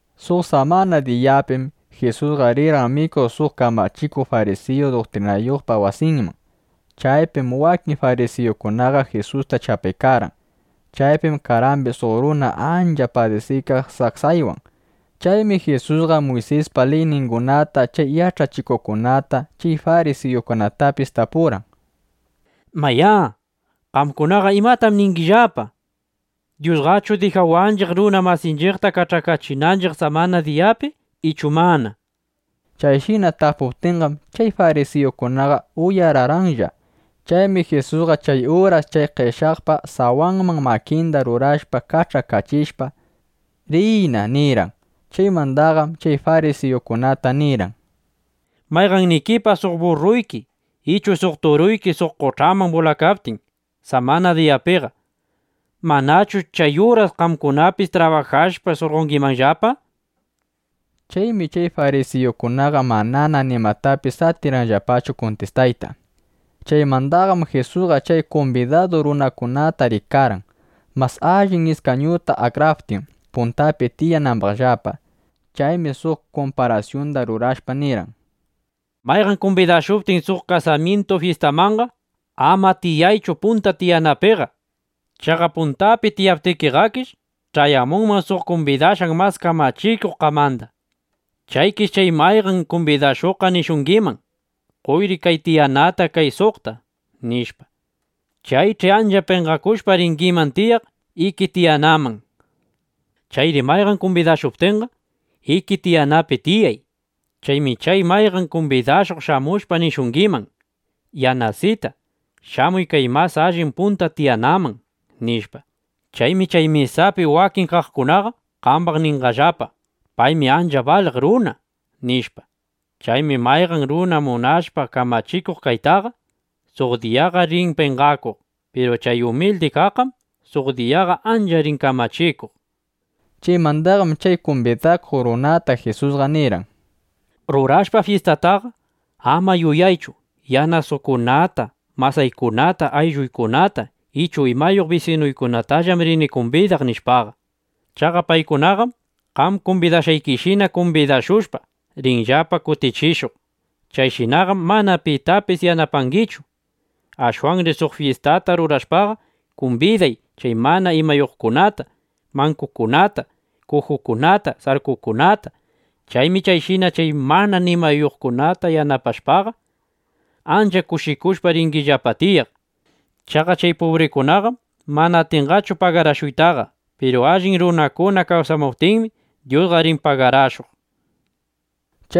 Suq samana diyapim Jisusqa rirqan mikuq suq kamachikuq farisiyu duktrinayuqpa wasinman. Chaypim wakin farisiyukunaqa Jisusta chapaykarqan. Chaypim karqambis suq runa ancha padisiykaq saksaywan. Chaymi Jisusqa Muysispa liyningunata chay yach'achikuqkunata, chay farisiyukunatapis tapurqan: —Mayá, ¿qamkunaqa imatam ningillapa? ¿Dyusqachu dijawanchiq, runa masinchiqta kach'akachinanchiq samana diyapi ichu mana? nishpa. Chayshina tapuptinqam, chay farisiyukunaqa uyararqanlla. Chaymi Jisusqa chay uras chay qeshyaqpa sawanman makinda rurashpa, kach'akachishpa: —Riyna, nirqan. Chaymandaqam chay farisiyukunata nirqan: —Mayqannikipa suq burruyki ichu suq turuyki suq qoch'aman bulakaptin samana diyapiqa, ¿manachu chay uraslla qamkunapis trabajashpa, surqongimanllapa? nishpa. Chaymi chay farisiyukunaqa manana nimatapis atirqanllapachu kuntistayta. Chaymandaqam Jisusqa chay kumbidadu runakunata rikarqan, mas allin iskañukunata akraptin, puntapi tiyanambaqllapa. Chaymi suq kumparasyunda rurashpa, nirqan: —Mayqan kumbidashuptin suq kasamyintu fyistamanqa, ama tiyaychu punta tiyanapiqa. Chaqa puntapi tiyaptikiqakish, ch'ayamunman suq kumbidashqan mas kamachikuq qamanda. Chaykish chay mayqan kumbidashuqqa nishungiman: “Qoyri kay tiyanata kay suqta”, nishpa. Chaych'i ancha penqakushpa, ringiman tiyaq iki tiyanaman. Chayri mayqan kumbidashuptinqa, iki tiyanapi tiyay. Chaymi chay mayqan kumbidashuq shamushpa nishungiman: “Yanasita (Yanasitu), shamuy kay mas allin punta tiyanaman”, nishpa. Chaymi chay mesapi wakin kaqkunaqa qambaq ninqallapa: “Paymi ancha baliq runa”, nishpa. Chaymi mayqan runa munashpa kamachikuq kaytaqa, suq diyaqa rin penqakuq. Piru chay umildi kaqqam suq diyaqa ancha rin kamachikuq, nishpa. Chaymandaqam chay kumbidakuq runata Jisusqa nirqan: —Rurashpa fyistataqa, ama yuyaychu: Yanasaykunata (Yanasuykunata), masaykunata, aylluykunata ichu imayuq bisinuykunatallam rini kumbidaq, nishpaqa. Chaqa paykunaqam qam kumbidashqaykishina kumbidashushpa, rinllapa kutichishuq. Chayshinaqam mana pitapis yanapaykangichu. Ashwanri suq fyistata rurashpaqa, kumbiday chay mana imayuqkunata, mankukunata, kujukunata, sarkukunata. Chaymi chayshina chay mana imayuqkunata yanapashpaqa, ancha kushikushpa ringillapa tiyaq. Chaqa chay pubrikunaqam mana atinqachu pagarashuytaqa. Piru allin runakuna kawsamuptinmi, Dyusqa rin pagarashuq, nishpa.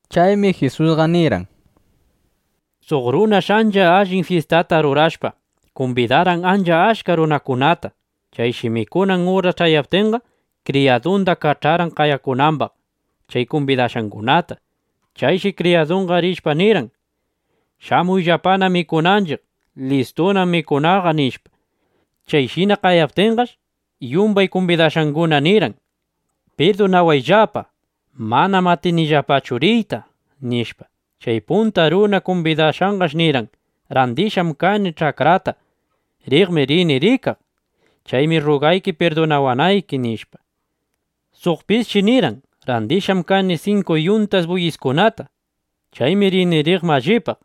Chaymi Jisusqa nirqan: —Suq runash ancha allin fyistata rurashpa, kumbidarqan ancha achka runakunata. Chayshi mikunan uras ch'ayaptinqa, kriyadunda kach'arqan qayamunambaq chay kumbidashqangunata. Chayshi kriyadunqa rishpa nirqan: “Shamuyllapana mikunanchiq. Listunam mikunaqa”, nishpa. Chayshina qayaptinqash, yumbay kumbidashqangunaqa nirqan: “Pirdunawayllapa. Manam atinillapachu riyta”, nishpa. Chay punta runa kumbidashqaqash nirqan: “Randishqam kani ch'akrata. Riqmi rini rikaq. Chaymi rrugayki pirdunawanayki”, nishpa. Suqpisshi nirqan: “Randishqam kani sinku yuntas buyiskunata. Chaymi rini riq mallipaq.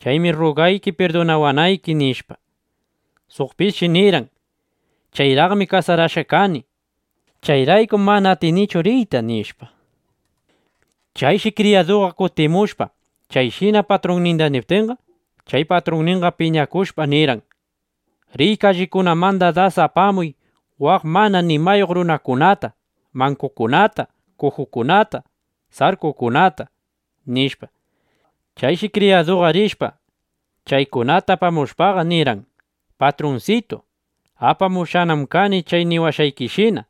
Chaymi rrugayki pirdunawanayki”, nishpa. Suqpisshi nirqan: “Chayraqmi kasarashqa kani. Chayraykum mana atinichu riyta”, nishpa. Chayshi kriyadu kutimushpa, chayshina patrunninda niptinqa, chay patrunninqa piñakushpa, nirqan: “Riy kallikunamanda das apamuq waq mana nimayuq runakunata, mankukunata, kujukunata, sarkukunata”, nishpa. Chayshi kriyaduqa rishpa, chaykunata apamushpaqa, nirqan: “Patrunsitu, apamushqanam kani chay niwashqaykishina.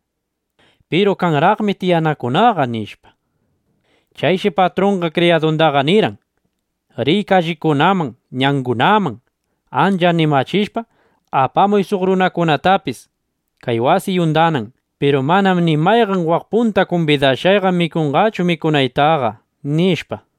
Piru kanraqmi tiyanakunaqa”, nishpa. Chayshi patrunqa kriyadundaqa nirqan: “Riy kallikunaman, ñangunaman. Ancha animachishpa, apamuy suq runakunatapis, kay wasiy undanan. Piru manam ni mayqan waq punta kumbidashqayqa mikunqachu mikunaytaqa”, nishpa.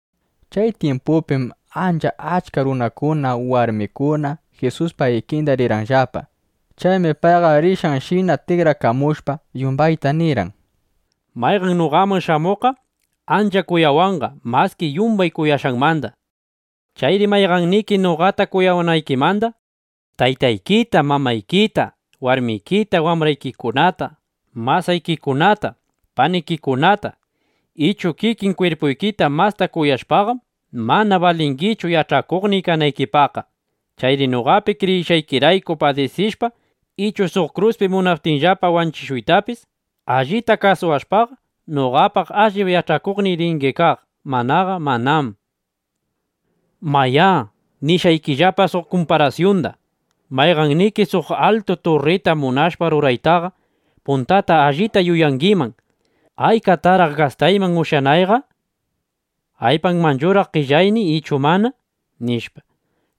Chay tyimpupim ancha achka runakuna, warmikuna Jisuspa ikinda rirqanllapa. Chaymi payqa rishqanshina tikrakamushpa, yumbayta nirqan: —Mayqan noqaman shamuqqa ancha kuyawanqa maski yumbay kuyashqanmanda. Chayri mayqanniki noqata kuyawanaykimanda taytaykita, mamaykita, warmikita, wambraykikunata, masaykikunata, panikikunata ichu kikin kwirpuykita masta kuyashpaqam, mana balingichu yach'akuqniy kanaykipaqqa. Chayri noqapi kriyishqaykirayku padisishpa, ichu suq kruspi munaptinllapa wanchishuytapis, allita kasuwashpaqa, noqapa allip yach'akuqniy ringi kaq; manaqa manam. ’(Mayá, nishqaykillapa suq kumparasyunda:) Mayqanniki suq altu turrita munashpa ruraytaqa, puntata allita yuyangiman: ¿Aykataraq gastayman ushyanayqa? ¿Aypanmanchuraq qellayniy ichu mana? nishpa.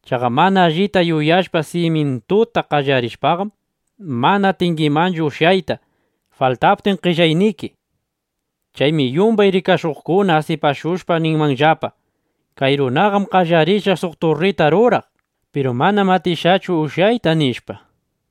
Chaqa mana allita yuyashpa, simyintuta qallarishpaqam, mana atingimanchu ushyayta, faltaptin qellayniki. Chaymi yumbay rikashuqkuna asipashushpa ninmanllapa: “Kay runam qallarishqa suq turrita ruraq; piru manam atishqachu ushyayta”, nishpa.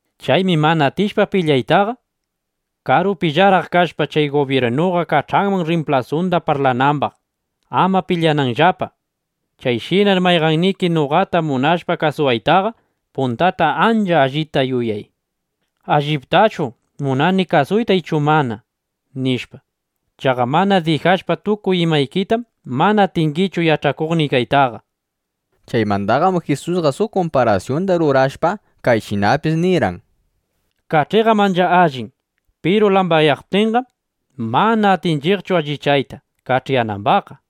Chaymi mana atishpa pilyaytaqa, karupillaraq kashpa, chay gubyirnuqa kach'anman rrimplasunda parlanambaq, ama pilyananllapa. (Chayshinar mayqanniki noqata munashpa kasuwaytaqa, puntata ancha allita yuyay: ¿Alliptachu munani kasuyta ichu mana? nishpa.) Chaqa mana dijashpa tukuy imaykitam, mana atingichu yach'akuqniy kaytaqa. Chaymandaqam Jisusqa suq kumparasyunda rurashpa, kayshinapis nirqan: —Kach'iqam ancha allin. Piru lambaqyaptinqam, mana atinchiqchu allichayta kach'iyanambaqqa.